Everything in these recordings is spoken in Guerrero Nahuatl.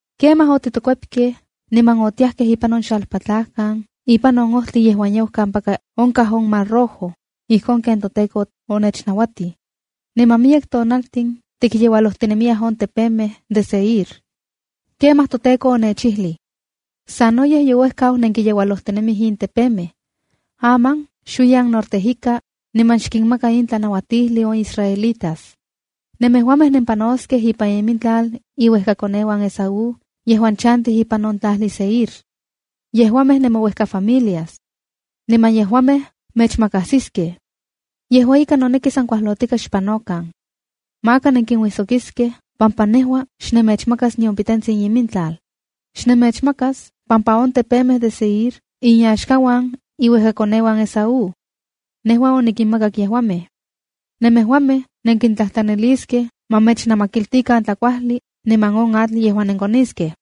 ’Kemaj otitokuepkej, niman otiajkej ipan on xalpatlajkan ipan on ojtli yejuan yau kampaka onkaj on Mar Rojo, ijkon ken toTEKO onechnauatij. Niman miyek tonaltin tikyeualojtinemiyaj on tepemej de Seir. ’Kemaj toTEKO onechijlij: ‘Sanoyej youejkau nenkiyeualojtinemij in tepemej. Aman xuiyan norte ika, niman xkinmaka in tlanauatijli on israelitas: Nemejuamej nenpanoskej ipan imintlal iuejkakoneuan Esaú yejuan chantij ipan on tlajli Seir. Niman yejuamej nemouejkafamilias. Yejuamej mechmakajsiskej. Yejua ika, noneki san kuajlotika xpanokan. Maka nenkinuijsokiskej pampa nejua xnemechmakas nion pitetsin imintlal. Xnemechmakas pampa on tepemej de Seir inyaxkauan iuejkakoneuan Esaú. Nejua onikinmakak yejuamej. Nemejuamej nenkintlajtlaniliskej ma mechnamakiltikan tlakuajli niman on atl yejuan nenkoniskej.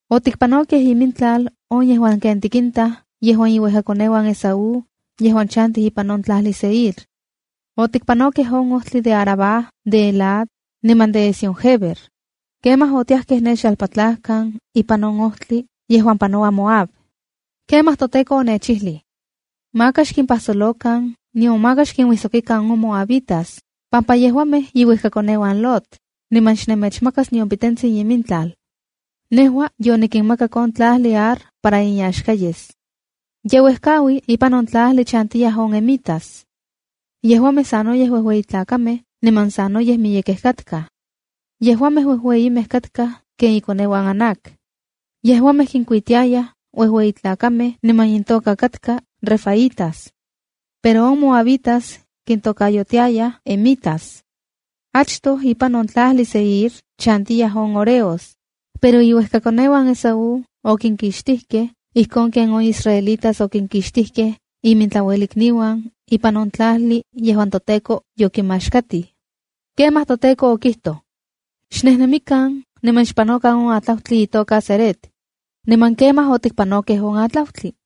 ’Otikpanokej imintlal on yejuan ken tikintaj yejuan iuejkakoneuan Esaú yejuan chantij ipan on tlajli Seir. Otikpanokej on ojtli de Arabá de Elat, niman de Ezión-guéber. Kemaj otiajkej ne xalpatlajkan ipan on ojtli yejuan panoua Moab. ’Kemaj toTEKO onechijlij: ‘Maka xkimpajsolokan, nion maka xkinuijsokikan on Moabitas, pampa yejuamej iuejkakoneuan Lot, niman xnemechmakas nion pitentsin imintlal. Nejua yonikinmakak on tlajli Ar para inyaxka yes.’ (Ye uejkaui ipan in tlajli chantiyaj on emitas. Yejuamej sanoyej uejueyitlakamej niman sanoyej miyekej katkaj. Yejuamej uejueyimej katkaj ken ikoneuan Anac. Yejuamej kinkuitiayaj uejueyi tlakamej niman intoka katka refaítas, pero on moabitas kintokayotiayaj emitas. Achtoj ipan on tlajli Seir chantiyaj on horeos, pero iuejkakoneuan Esaú okinkixtijkej, ijkon ken on israelitas okinkixtijkej imintlauelikniuan ipan on tlajli yejuan toTEKO yokimaxkatij.) ’Kemaj toTEKO okijtoj: ‘Xnejnemikan niman xpanokan on atlautli itoka Zered.’ Niman kemaj otikpanokej on atlautli.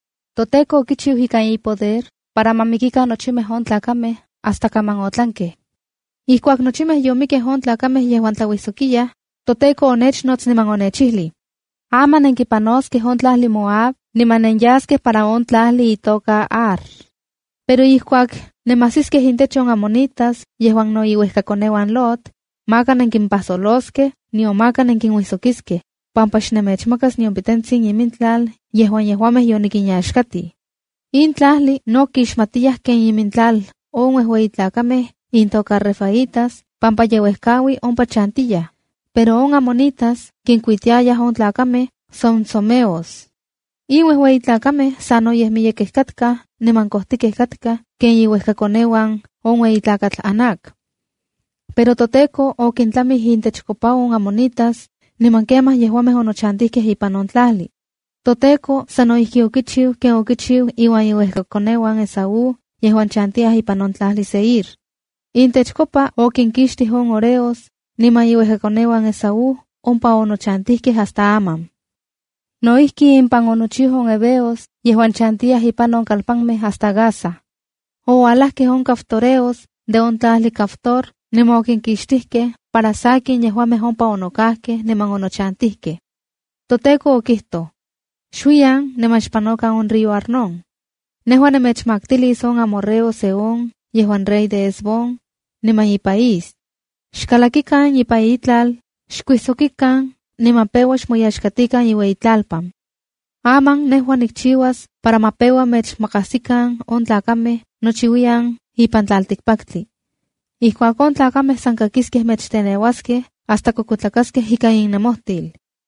ToTEKO okichiu ikan ipoder para ma mikikan nochimej on tlakamej hasta kaman otlankej. “Ijkuak nochimej yomikej on tlakamej yejuan tlauijsokiyaj, toTEKO onechnots niman onechijlij: ‘Aman nenkipanoskej on tlajli Moab niman nenyaskej para on tlajli itoka Ar. Pero ijkuak nemajsiskej intech on amonitas yejuan no iuejkakoneuan Lot, maka nenkimpajsoloskej nion maka nenkinuijsokiskej, pampa xnemechmakas nion pitetsin imintlal yejuan yejuamej yonikinyaxkatij.’ ’(In tlajli, no kixmatiyaj ken imintlal on uejueyi tlakamej intoka refaítas pampa ye uejkaui ompa chantiyaj, pero on amonitas kinkuitiayaj on tlakamej zomzomeos. In uejueyitlakamej sanoyej miyekej katkaj niman kojtikej katkaj ken iuejkakoneuan on ueyi tlakatl Anac. Pero toTEKO okintlamij intechkopa on amonitas, niman kemaj yejuamej onochantijkej ipan on tlajli. ToTEKO sano ijki okichiu ken okichiu iuan iuejkakoneuan Esaú yejuan chantiyaj ipan on tlajli Seir. Intechkopa okinkixtijkej on horeos, niman iuejkakoneuan Esaú ompa onochantijkej hasta aman. No ijki, impan onochiu on heveos yejuan chantiyaj ipan on kalpanmej hasta Gaza. Oualajkej on caftoreos de on tlajli Caftor niman okinkixtikej para sakin yejuamej ompa onokajkej niman onochantijkej.) ’ToTEKO okijtoj: ‘Xuiyan niman xpanokan on río Arnón. Nejua nemechmaktilis on amorreo Sehón yejuan rey de Hesbón, niman ipaís. Xkalakikan ipan itlal, xkuijsokikan niman peua xmoyaxkatikan iueyitlalpan. Aman nejua nikchiuas para ma peua mechmakasikan on tlakamej nochiuiyan ipan tlaltikpaktli. Ijkuak on tlakamej san kakiskej mechteneuaj hasta kuekuetlakaskej ika innemojtil.’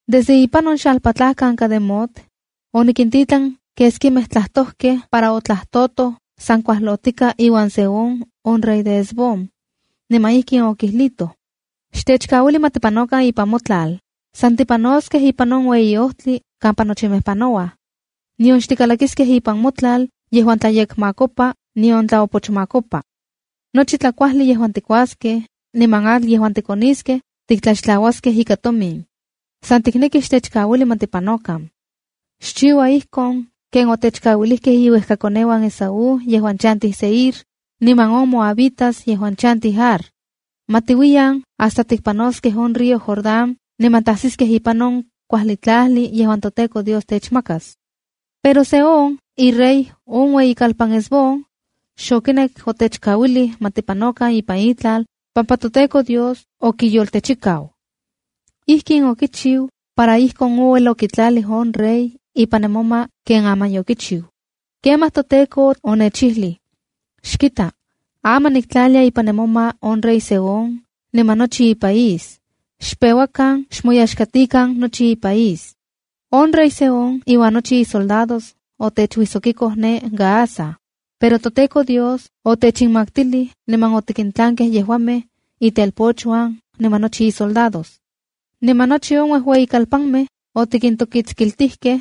’Desde ipan on xalpatlajkan Cademot, onikintitlan keskimej tlajtojkej para otlajtotoj san kuajlotika iuan Sehón on rey de Hesbón. Niman ijkin okijlitoj: ’Xtechkauili ma tipanokan ipan motlal, san tipanoskej ipan on ueyi ojtli kampa nochimej panouaj. Nion xtikalakiskej ipan motlal yejuan tlayekmakopa nion tlaopochmakopa. Nochi tlakuajli yejuan tikuaskej niman atl yejuan tikoniskej tiktlaxtlauaskej ika tomin. San tiknekij xtechkauili ma tipanokan. Xchiua ijkon ken otechkauilijkej iuejkakoneuan Esaú yejuan chantij Seir, niman on moabitas yejuan chantij Ar. Ma tiuiyan hasta tikpanoskej on río Jordán niman tajsiskej ipan on kuajli tlajli yejuan toTEKO Dios techmakas. ’Pero Sehón, irey on ueyitlalpan Hesbón, xokinek otechkauilij ma tipanokan ipan itlal pampa toTEKO Dios okiyoltechikau. Ijkin okichiu para ijkon ouel okitlalij on rey ipan nemoma ken aman yokichiu. ’Kemaj toTEKO onechijlij: Xkitaj, aman niktlalia ipan nemoma on rey Sehón niman nochi ipaís. Xpeuakan xmoyaxkatikan nochi ipaís. ’On rey Sehón iuan nochi isoldados otechuijsokiko ne Jahaza, pero toTEKO Dios otechinmaktilij niman otikintlankej yejuamej, itelpochuan niman nochi isoldados. Niman nochi on uejueyikalpanmej otikintokitskiltijkej,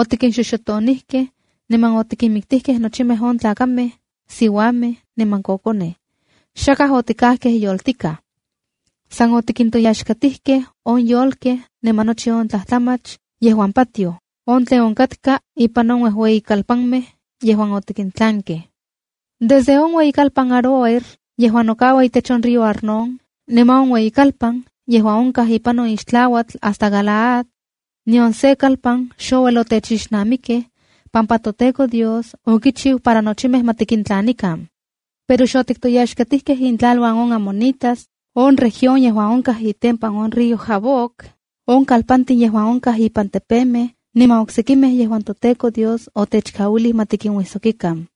otikinxoxotonijkej, niman otikinmiktijkej nochimej on tlakamej, siuamej niman kokonej. Xakaj otikajkej yoltikaj. San otikintoyaxkatijkej on yolkej niman nochi on tlajtlamach yejuan patioj, on tlen onkatka ipan on uejueyikalpanmej yejuan otikintlankej. ’Desde on ueyikalpan Aroer yejuan nokaua itech on río Arnón, niman on ueyikalpan yejuan onkaj ipan on ixtlauatl hasta Galaad, nion se kalpan xouel otechixnamikej, pampa toTEKO Dios okichiu para nochimej ma tikintlanikan. Pero xotiktoyaxkatijkej intlaluan on amonitas, on región yejuan onkaj itempan río Jaboc, on kalpantin yejuan onkaj ipan tepemej niman oksekimej yejuan toTEKO Dios xotechkauilij ma tikinuijsokikan.